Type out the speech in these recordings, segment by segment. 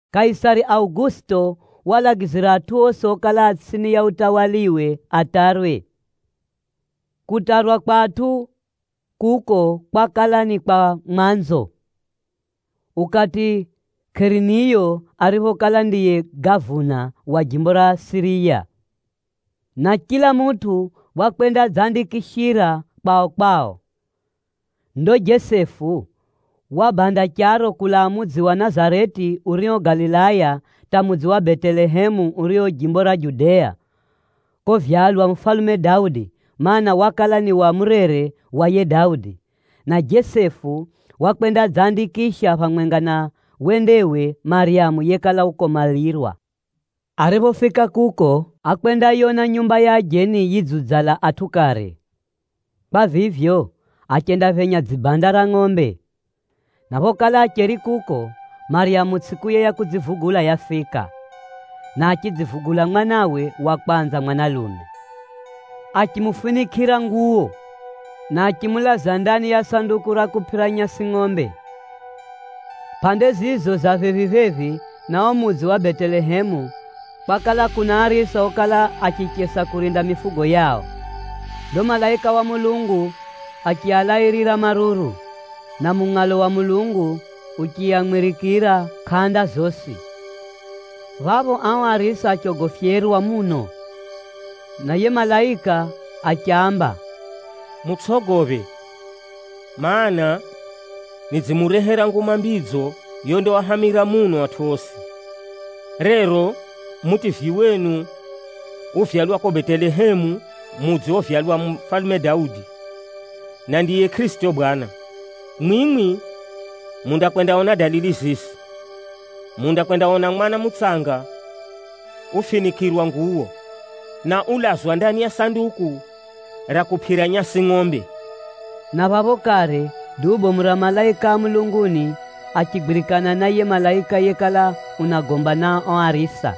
Kaisari Augusito walagizira atʼu osi okala a tsʼini ya utawaliwe atarwe. Kutarwa kwa atʼu kuko kwakala ni kwa mwanzo, ukati Kireniyo ariphokala ndiye gavuna wa jimbo ra Siriya. Na chila mutʼu wakwendadzandikishira kwao-kwao. Ndo Jesefu wabanda charo kulaa mudzi wa Nazareti urio Galilaya, hata mudzi wa Betelehemu urio jimbo ra Judea, kovyalwa mufalume Daudi, mana, wakala ni wa murere wa yiye Daudi. Na Jesefu wakwendadzandikisha phamwenga na wendewe Maryamu yekala ukomalirwa. Ariphofika kuko ákwendayona nyumba ya ajeni yidziudzala atʼu kare. Kwa vivyo, achendaphenya dzibanda ra ngʼombe. Na phokala acheri kuko, Maryamu tsʼikuye ya kudzivugula yafika, na achidzivugula mwanawe wa kwanza mwanalume. Achimufinikʼira nguwo, na achimulaza ndani ya sanduku ra kupʼira nyasi ngʼombe. Pʼande zizo za phephi-phephi na uo mudzi wa Betelehemu, kwakala kuna arisa okala achichesa kurinda mifugo yao. Ndo malaika wa Bwana achialairira maruru, na mungʼalo wa Mulungu uchiamwirikira kʼanda zosi. Phapho ao arisa achogofyerwa muno, na yiye malaika achiaamba, “Mutsʼogophe! Maana, nidzimurehera Nguma Mbidzo yondaahamira muno atʼu osi. Rero Mutivyi wenu uvyalwa kuko Betelehemu mudzi ovyalwa mufalume Daudi, na ndiye Kʼirisito Bwana. Mwimwi mundakwendaona dalili zizi: mundakwendaona mwana mutsanga ufinikʼirwa nguwo, na ulazwa ndani ya sanduku ra kupʼira nyasi ngʼombe.” Na phapho kare, duu bomu ra malaika a mulunguni achigwirikana na yiye malaika yekala unagomba na ao arisa,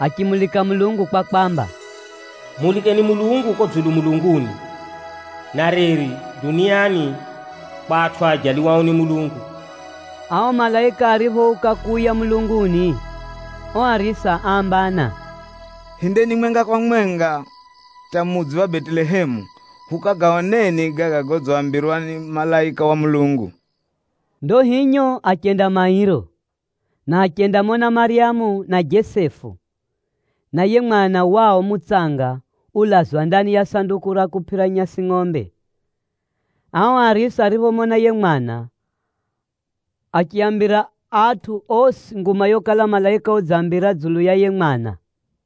achimulika Mulungu kwa kwamba, “Mulikeni Mulungu kuko dzulu mulunguni, na reri duniani kwa atʼu aajaliwao ni Mulungu!” Ao malaika ariphouka kuuya mulunguni, ao arisa áambana, “Hindeni mwenga kwa mwenga hata mudzi wa Betelehemu, hukagaoneni gaga godzambirwa ni malaika wa Mulungu.” Ndo hinyo achenda mairo, na achendamona Maryamu na Jesefu, na yiye mwana wao mutsanga ulazwa ndani ya sanduku ra kupʼira nyasi ngʼombe. Ao arisa ariphomona yiye mwana, achiaambira atʼu osi nguma yokala malaika udziaambira dzulu ya yiye mwana.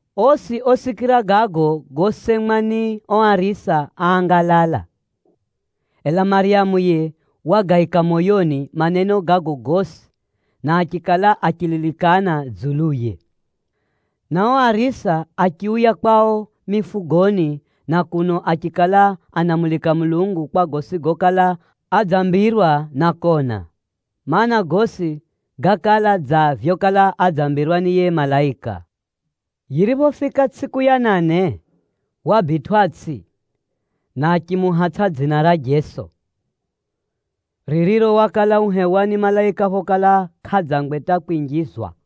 Osi osikira gago gosemwa ni ao arisa áangalala. Ela Maryamu yiye wagaika moyoni maneno gago gosi, na achikala achililikana dzuluye. Na ao arisa achiuya kwao mifugoni na kuno achikala anamulika Mulungu kwa gosi gokala adzambirwa na kona, mana, gosi gákala dza vyokala adzambirwa ni yiye malaika. Yiriphofika tsʼiku ya nane, wabitwʼatsʼi, na achimuhatsʼa dzina ra Jeso, ririro wakala uhewa ni malaika phokala kʼadzangwe hata kwinjizwa.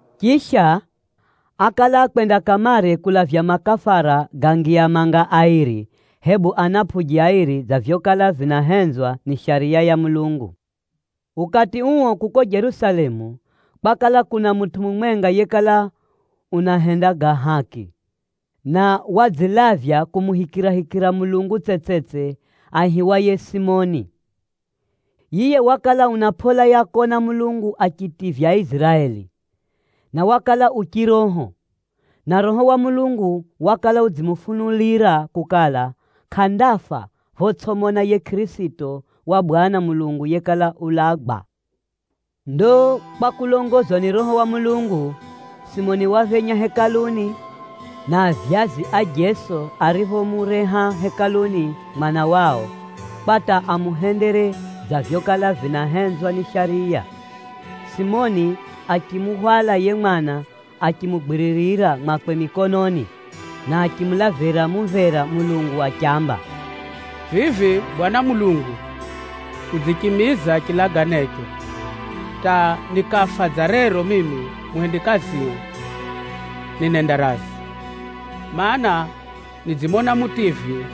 Chisha, ákala akwenda kamare kulavya makafara ga ngiya airi, hebu ana ngiya manga airi dza vyokala vinahenzwa ni Shariya ya Mulungu. Ukati uo kuko Jerusalemu, kwakala kuna mutʼu mumwenga yekala unahenda ga haki, na wadzilavya kumuhikirahikira Mulungu tsetsetse aihiwaye Simioni. Yiye wakala una pʼola ya kona Mulungu achitivya Aiziraeli, na wakala u chiroho. Na Roho wa Mulungu wakala udzimufunulira kukala, kʼandafa photsʼimona yiye Kʼirisito wa Bwana Mulungu yekala ulagwa. Ndo kwa kulongozwa ni Roho wa Mulungu, Simioni waphenya Hekaluni, na avyazi a Jeso ariphomureha Hekaluni mwana wao, kwa hata amuhendere dza vyokala vinahenzwa ni Shariya, Simioni achimuhwala yiye mwana achimugwiririra mwakwe mikononi, na achimulavira mumvera Mulungu achiamba, “Vivi Bwana Mulungu, udzichimiza chilaganecho hata nikafa dza rero mimi muhumikio ninenda razi. Maana, nidzimona Mutivyi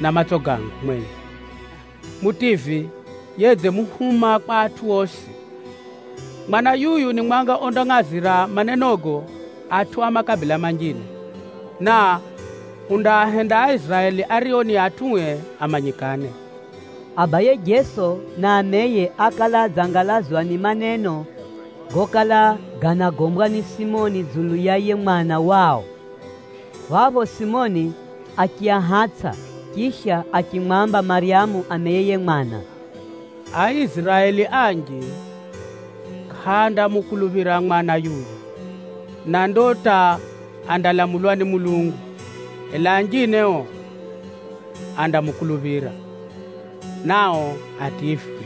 na matso gangu mwenye, Mutivyi yedzimuhuma kwa atʼu osi. Mwana yuyu ni mwanga ondangʼazira manenogo atʼu a makabila manjine, na undaahenda Aiziraeli ario ni atʼue amanyikane.” Abaye Jeso na ameye ákala adzangalazwa ni maneno gokala ganagombwa ni Simoni dzulu ya yiye mwana wao. Phapho Simioni achiahatsʼa, chisha achimwamba Maryamu ameye yiye mwana, “Aiziraeli anji kʼaandamukuluphira mwana yuyu, na ndo hata andalamulwa ni Mulungu. Ela anjine o andamukuluphira, nao ativywe.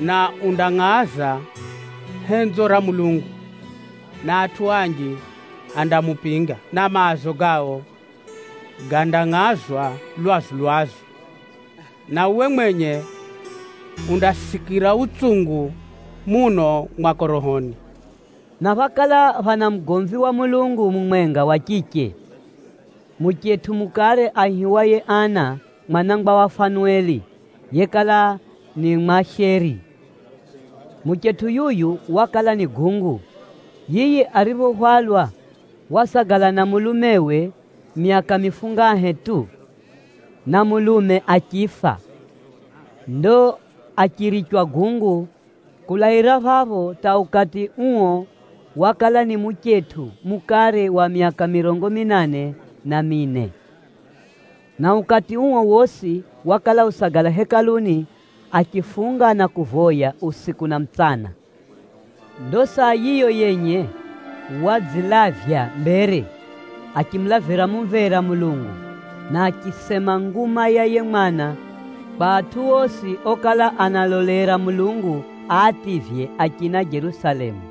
Na undangʼaza henzo ra Mulungu, na atʼu anji andamupinga na maazo gao gandangʼazwa lwazu-lwazu. Na uwe mwenye undasikira utsungu muno mwako rohoni.” Na phákala phana mugomvi wa Mulungu mumwenga wa chiche, muchetʼu mukare aihiwaye Ana mwanangwa wa Fanueli, yekala ni Mwasheri. Muchetʼu yuyu wakala ni gungu. Yiye ariphohwalwa wasagala na mulumewe myaka mifungahe tu, na mulume achifa. Ndo achirichwa gungu kulaira phapho hata ukati uo wakala ni muchetʼu mukare wa myaka mirongo minane na mine. Na ukati uo wosi wakala usagala Hekaluni achifunga na kuvoya usiku na mutsana. Ndo saa yiyo yenye wadzilavya mbere achimulavira mumvera Mulungu, na achisema nguma ya yiye mwana kwa atʼu osi okala analolera Mulungu aativye achina Jerusalemu.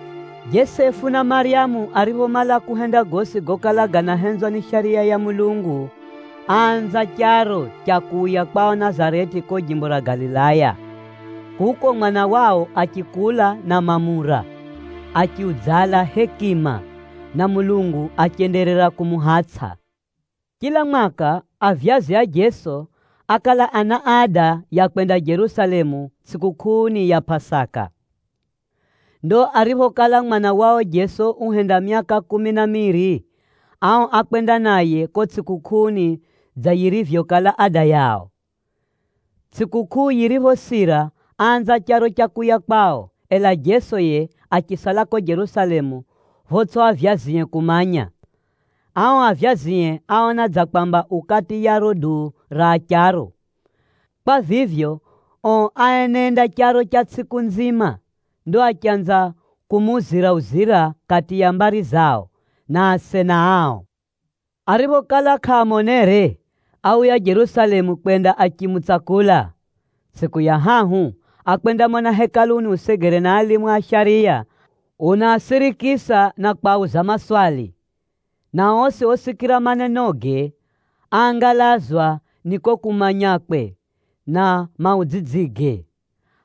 Jesefu na Maryamu ariphomala kuhenda gosi gokala ganahenzwa ni Shariya ya Mulungu, áanza charo cha kuuya kwao Nazareti kuko jimbo ra Galilaya. Kuko mwana wao achikula na mamura, achiudzala hekima, na Mulungu achenderera kumuhatsʼa. Chila mwaka, avyazi a Jeso ákala ana ada ya kwenda Jerusalemu tsʼikukʼuuni ya Pʼasaka. Ndo ariphokala mwana wao Jeso uhenda myaka kumi na miiri, ao ákwenda naye kuko tsʼikukʼuuni dza yirivyokala ada yao. Tsʼikukʼuu yiriphosira, áanza charo cha kuuya kwao, ela Jeso yiye achisala kuko Jerusalemu photsʼi avyazie kumanya. Ao avyazie áona dza kwamba u kati ya riro duu ra acharo. Kwa vivyo, ao aenenda charo cha tsʼiku nzima, ndo achanza kumuuzira-uzira kati ya mbari zao, na asena ao. Ariphokala kʼaamonere, áuya Jerusalemu kwenda achimutsakula. Tsʼiku ya hahu, ákwendamona Hekaluni usegere na alimu a shariya, unaasirikisa na kwauza maswali, na osi osikira manenoge, áangalazwa ni kuko kumanyakwe na maudzidzige.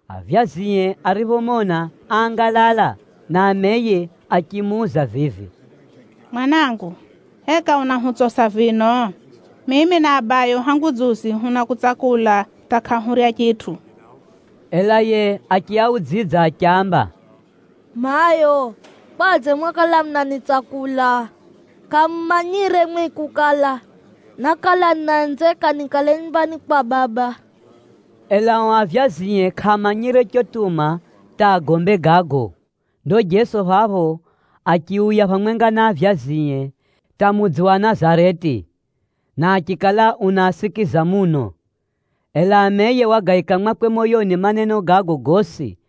Avyazie ariphomona áangalala, na ameye achimuuza vivi, “Mwanangu, heka unahutsosa vino? Mimi na abayo hangu dzuzi hunakutsakula hata kʼahurya chitʼu.” Ela yiye achiaudzidza achiaamba, “Mayo, kwadze mwakala munanitsakula? Kʼamumanyire mwimwi kukala, nákala ninahenzeka nikale nyumbani kwa Baba?” Ela ao avyazie kʼaamanyire chotuma hata agombe gago. Ndo Jeso phapho achiuya phamwenga na avyazie hata mudzi wa Nazareti, na achikala unaasikiza muno. Ela ameye wagaika mwakwe moyoni maneno gago gosi.